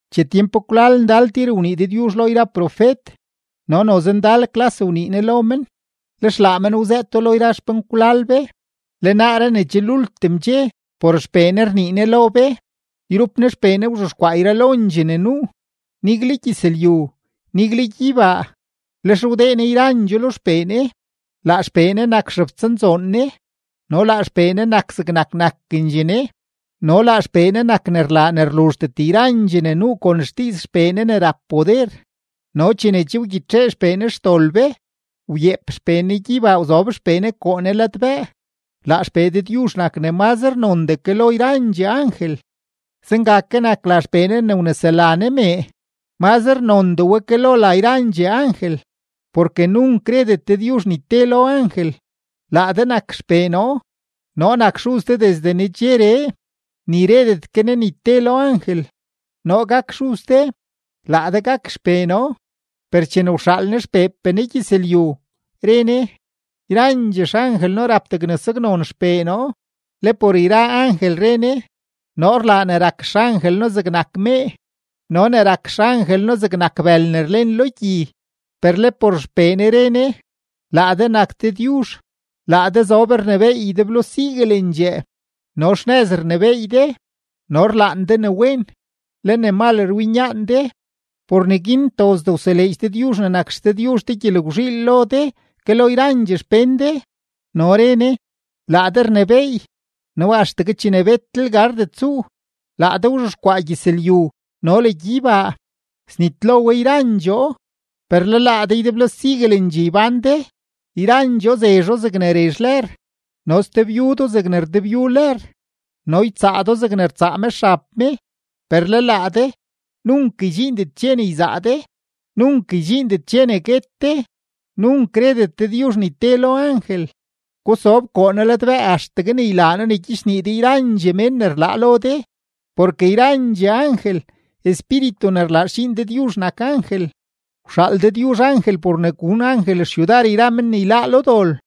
Che tyempkwlal ndal tir wnii Dëdyuzh lo yra profet no noze ndal klas wnii Ne lo men, lex laa men wzëëto lo yra xpenkwlal be. Le naaree ne che lultim dxe, por XPee Ne rnii Ne lo be; yrup Ne XPee Ne wzhexkwaa yralondxee ne nuu, nigle gyëzlyu, nigle gyeybaa, lex wdee Ne yrandxoo lo XPee Ne. Laa XPee Ne nak xebtsanzoon Ne, no laa XPee Ne nak zegnak nakendxee Ne, no laa XPee Ne nak ne rlaa ne rluzhdet yrandxee ne nuu kon xdiiz XPee Ne ne rap poder, no chene che wgyitxee XPee Ne xdol be, wyeep XPee Ne gyeybaa wzob XPee Ne koo Ne ladbëë. Laa XPee Dëdyuzh nak ne mazre nondee ke lo yrandxee angel, zenga ke nak la XPee Ne ne wnesela Ne mee, mazre nondee we ke lo la yrandxee angel. Porke nunk redet Dëdyuzh ni te lo angel: Laa de nak XPee noo; noo nak xuz de desde nedxeree; ni redet ke Ne ni te lo angel: Noo gak xuz de, laa de gak xpee noo. Per chene wxaal Ne XPeepee Ne gyëzlyu, re Ne: Yrandxee xangel noo rap degne saknon XPee noo. Le por yra angel re Ne: Noo rlaa ne rak xangel noo zegnak mee no ne rak xangel noo zegnak bël ne rlen lo gyi. Per le por XPee Ne re Ne: Laa de nak Dëdyuzh, laa de zob rnebééy ydeblo siguelendxee, no xnëz rnebééy de. No rlaan de ne wen, le ne mal rwinyaan de; por neguin ntozdee wseleedx Dëdyuzh ne nak XDëdyuzh de gyelgwzhiil lo de ke lo yrandxee xpén de. No re Ne: Laa de rnebééy no axtegue chene betlel gardet tsuu, laa de wzhexkwaa gyëzlyu no le gyeybaa. Snitlo we yrandxoo, per le laa de ydeblo siguelendxee ybán de; yrandxoo zezho zegne rezh lër, no sdebyu do zegne rdebyu lër, no ytsaa do zegne rtsaa me xab me. Per le laa de, nunk ydxiindet dxe ne yzaa de, nunk ydxiindet dxe ne guet de. Nunk redet Dëdyuzh ni te lo angel: Gusob koo noo ladbëë axtegue ne ylaa noo ne gyichnii de yrandxee mén ne rlaa lo de. Porke yrandxee angel, espíritu ne rlaa xdxiin Dëdyuzh nak angel. Wxaal Dëdyuzh angel por ne gun angel xyudar men ne yláá lo dol.